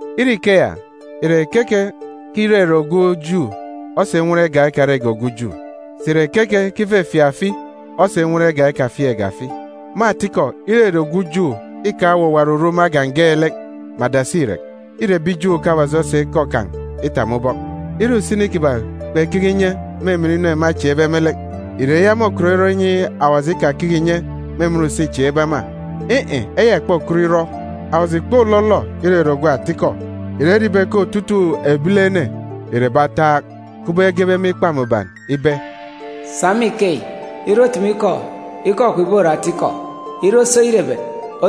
Ire ikeya, ìre keke ke irere ogwu Ju osa inwọn igak ekarege ogwu Ju? Sà ìre keke ke ifefieek afi osa inwọn igak ekafieekge afi? Me atikọ, irere ogwu Ju îkaan̄ owuwa oruru me agan̄ geelek. Me adasi irek, îre ebi Ju ke Awaji osa ikọ kan̄ itap me ubọk. Ire usini kiban̄ kpekeke inye me emen inu ema echieekbe me lek, ìre eya môkọt irọ inyi Awaji ikakeke ìnye me emen use îchieekbe ema? In̄-in̄, eya ìkpokọt irọ! Awaji ìkpolọlọ irere ogwu atikọ, ìrere ibe ke otutuuk ebilene ìre ebi ataak, kubọk egebe me Ikpa Mbuban ibe, “Sa me ikeyi, ire otumu ikọ, ikọ kwun̄ ìbore atikọ. Ire osi oyerebet,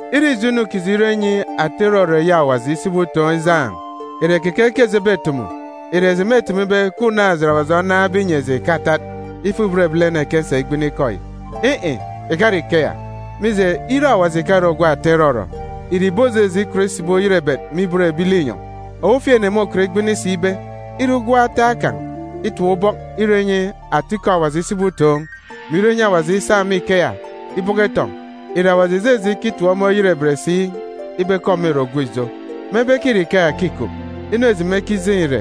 Ire ijo inu kiji irọ inyi ata irọrọ eyi Awaji isibi utoon̄ ijaan̄, ìre keke ke eji ebetumu? Ìre eji mêtumu ibe ke unaan̄-ejit Awaji onaan̄be inyi eji ìkatat? Ifuk-ibot ebilene ke nkisa igbini ikọ yi. In̄-in̄, ìkare ikeya! Mije, ire Awaji ìkare ogwu ata irọrọ, ìre ìbojeje ikọt isibi oyerebet me ibot ebi linyọn̄? Ofifi ene môkọt igbini si ibe, ire ugwem ataak kan̄ itap ubọk irọ inyi atikọ Awaji isibi utoon̄, mè irọ inyi Awaji isa me ikeya ibọkọ itọn̄, ìre Awaji ìjeje ikitip ọmọ oyerebet si ibe ke ọmọ ìre ogwu ijo? Mebe ke îre ikeya ke îkup, inu eji mekijeen̄ ìre,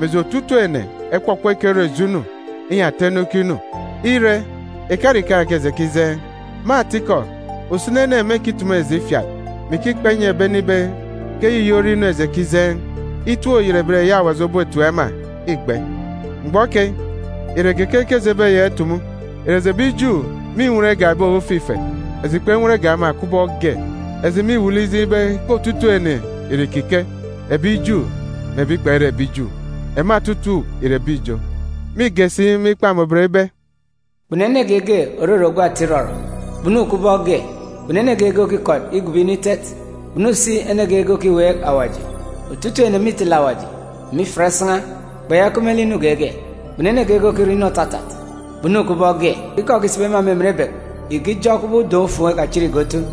mè eji otutuuk ene ekpọkpọ ekerọ ijo inu, inyi ata inu ikinu. Ire, ìkare ikeya ke eji ekijeen̄. Me atikọ, usini ene mêkitumu eji ifiat, mè ikikpa inyi ebi ene ibe ke eyiyi ore inu eji ekijeen̄. Itip-oyerebet eyi Awaji obotip ema îgbe. Mgbọ keyi, ìre keke ke eji ebeyaka itumu? Ìre eji ebi Ju mînwọn igak ebi ofifi ife? Eji kpenwọn igak ema kubọk ge! Eji mîwuuk lek ijeen̄ ibe ke otutuuk ene ìre ìkike, ebi Ju mè ebi kpere ebi Ju, ema otutuuk ìre ebi ijo. Mîge si me Ikpa Mbuban ibe, “Kpunu ene geege òrere ogwu ata irọrọ, kpunu kubọk ge! Kpunu ene geege òkikọt igobo inu eyi Awaji itet, kpunu si ene geege òkiweek Awaji. Otutuuk ene mîtele Awaji, mè ifiat isan̄a, kpeyaka ikup me lek inu geege. Kpunu ene geege òkirọ inu òtatat, Ikọ òkisibi ema me emen ebek ìkijọ kubọk udọn̄-ufuun̄ ekachitge otu.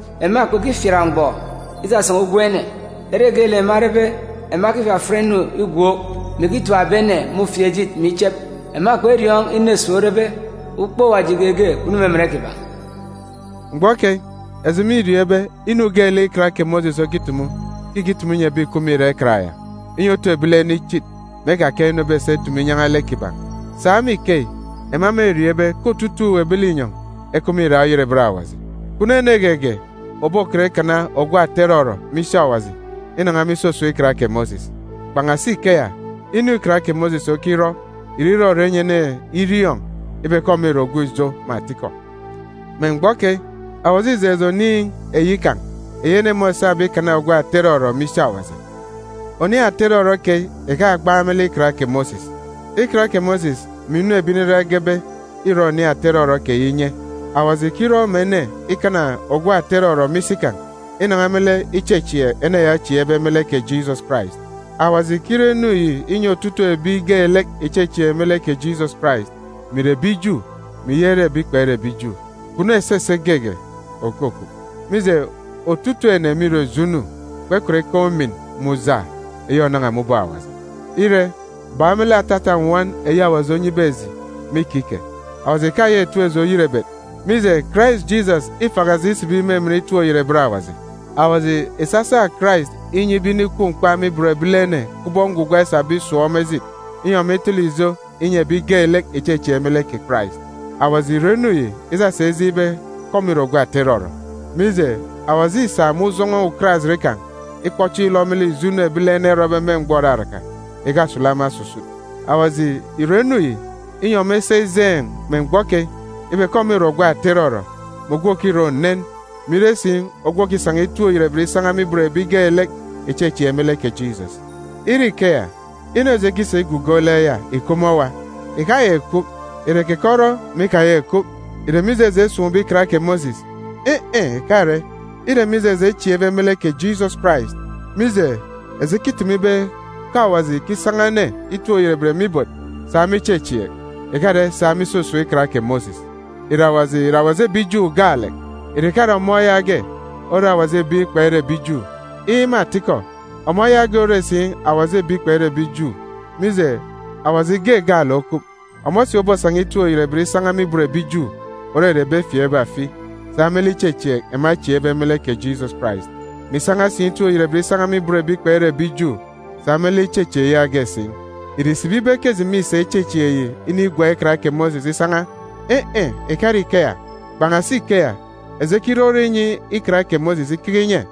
Ema kpekifiat mgbọ isasan̄a ugwem ene. Ere geelek ema erebe, ema ekifafiat inu igwook, mè èketap ebi ene me ufieejit mè ichep. Ema kperiọọn̄ inu esuuk orebe.f Ukpook Awaji geege kpunu me emen kiban̄.”g Mgbọ keyi, eji mîriọọn̄ ibe, inu geelek Ikan kè Mosis okitumu, ke ìkitumu inyi ebi ìkup me irak Ikan ya, inyi otu ebilene ichit, mè ekakaan̄ inu ebesa itumu inyan̄a lek kiban̄. Sa me ikeyi, ema mêriọọn̄ ibe ke otutuuk ebi linyọn̄ ekup me irak oyerebet Awaji. Kpunu ene geege òbokọt ikana ogwu ata irọrọ me isi Awaji inan̄a me isusun̄ Ikan kè Mosis. Kpan̄asi ikeya, inu Ikan kè Mosis okirọ ìre irọrọ inyi ene iriọọn̄ ibe ke ọmọ ìre ogwu ijo me atikọ. Me mgbọ keyi, Awaji îjeen̄ eji oniin̄ eyi kan̄ eyi ene môsabe ikana ogwu ata irọrọ me isi Awaji. Oniin̄ ata irọrọ keyi ìkagbaan̄ me lek Ikan kè Mosis. Ikan kè Mosis mè inu ebi Nriran egebe îrọ oniin̄ ata irọrọ keyi inye. Awaji ìkirọ mè ene ikana ogwu ata irọrọ me isi kan̄ inan̄a me lek ichechieek ene ya ochieekbe me lek kè Jisọs Karais. Awaji ìkirọ inu yi inyi otutuuk ebi geelek ìchechieek me lek kè Jisọs Karais, mè ìre ebi Ju, mè ìyaka ire ebi kpere ebi Ju. Kpunu esese geege òkukup. Mije, otutuuk ene mîrọ ijo inu, kpekọt ikaan̄ ujamgbugbo eyi ònan̄a me ubọk Awaji. Ire, bak me lek atata nnwọn eyi Awaji onyibe eji me ikike, Awaji ìkayaka ìtip eji oyerebet, mije, Karais Jisọs îfaka eji isibi me emen itip-oyerebet Awaji. Awaji ìsasa Karais inyi ibe inikwu mkpa me ibot ebilene kubọk ngwugwa esabe irọ esuuk, inyi ọmọ itele ijo inyi ebi geelek ìchechieek me lek kè Karais. Awaji ìrọ inu yi isasa ijeen̄ ibe ke ọmọ ìre ogwu ata irọrọ. Mije, Awaji îsa me ujọn̄ọ ukarajit kan̄ ikpọ chieen̄ ilọ me lek ijo inu ebilene erọbe me mgbọ òraraka, ìkasulu ema osusut. Awaji ìrọ inu yi, inyi ọmọ isa ijeen̄, me mgbọ keyi, ibe ke ọmọ ìre ogwu ata irọrọ, mè ogwu òkirọ unen, mè ire si ogwu òkisan̄a itip-oyerebet isan̄a me ibot ebi geelek ìchechieek me lek kè Jisọs. Ire ikeya, inu eji ekisa ìgugo lek ya ìkup me owa? Ìkayaka ìkup! Ìre keke orọ mè ikayaka ìkup? Ìre mije eji esun̄be Ikan kè Mosis? In̄-in̄, ìkare! Îre mije eji echieekbe me lek kè Jisọs Karais. Mije, eji ekitumu ibe ke Awaji ìkisan̄a ene itip-oyerebet me ibot sa me ichechieek, ìkare sa me isusun̄ Ikan kè Mosis. Ìre Awaji ìre Awaji ebi Ju gaalek? Ìre ìkare ọmọ yaage ore Awaji ebi kpere ebi Ju? Iin̄, me atikọ, ọmọ yaage ore si Awaji ebi kpere ebi Ju, mije, Awaji ge gaalek okup. Ọmọ si obosan̄a itip-oyerebet isan̄a me ibot ebi Ju, òrere ebi efieekbe afi, sa me lek ichechieek ema echieekbe me lek kè Jisọs Karais, mè isan̄a si itip-oyerebet isan̄a me ibot ebi kpere ebi Ju sa me lek ichechieek yaage si. Ìre ìsibi ibe ke eji mîsa ichechieek yi inigwak Ikan kè Mosis isan̄a? In̄-in̄, ìkare ikeya. Kpan̄asi ikeya, eji ekirọrọ inyi Ikan kè Mosis ikeke inye.